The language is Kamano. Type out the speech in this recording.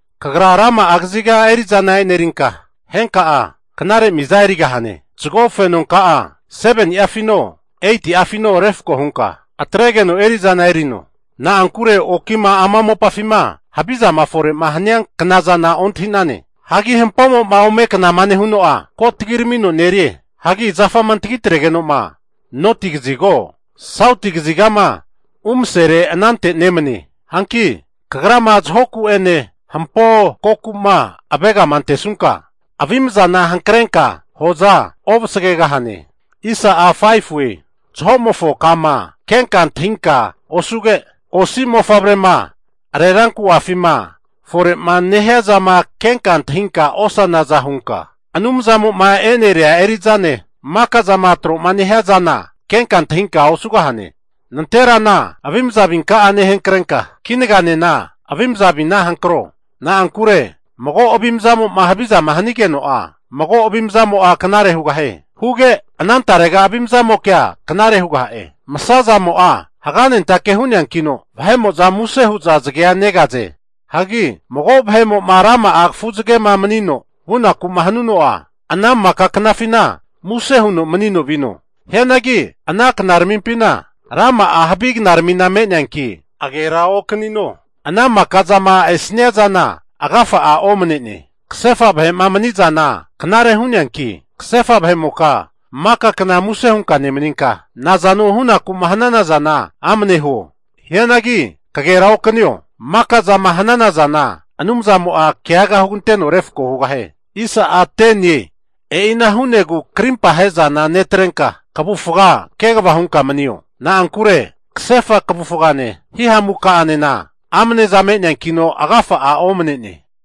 Kagra rama'a kaziga eri'zana e'nerinka, henka'a knare miza erigahane. Zago fenonka'a 7ni'afino 8'afino refako hunka atregeno erizana erino. Na'ankure okima ama mopafima havizama fore'ma hania knazana ontahi'nane. Hagi hampomo'ma ome knama nehuno'a, ko tagiramino nerie. Hagi zafama antagi atregeno'ma noti kazigo, sauti kazigama umasere anante nemane. Hanki kagrama zahoku'ene hampo koku'ma avegama antesunka avimzana hankrenka hoza ovasgegahane. Zaho'mofo kama kenka antahinka osuge, osi mofavrema areranku'afima fore'ma nehiazama kenka antahinka osanaza hunka, Anumzamo'ma e'neria eri'zane, maka zama tro'ma nehia zana kenka antahinka osugahane. Nanterana avimza avinka'a nehankrenka, kinaganena avimza avina hankro. Na'ankure mago avimzamo'ma havizama hanigeno'a, mago avimzamo'a knare hugahie. Huge anantarega avimzamokea knare hugaha'e. Masa zamo'a haganentake hu'neankino, vahe'mo'za muse hu'za zagea negaze. Hagi mago vahe'mo'ma rama'a kafu zagema manino vunaku'ma hanuno'a, ana maka knafina muse huno manino vino. Hianagi ana knaramimpina rama'a havi knaramina me'neanki, agera okanino. Ana maka zama esnia zana agafa'a omne'ne. Kasefa vahe'ma mani'zana knare hu'neanki, kasefa vahe'moka maka kna muse hunka nemaninka, nazano hunaku'ma hanana zana amne huo. Hianagi kagera okanio, maka zama hanana zana Anumzamo'a keaga huganteno refko hugahie. E'ina hu'negu krimpa ahezana netrenka, kavufga kegava hunka manio. Na'ankure kasefa kavufgane hihamukanena amneza me'neankino agafa'a omane'ne.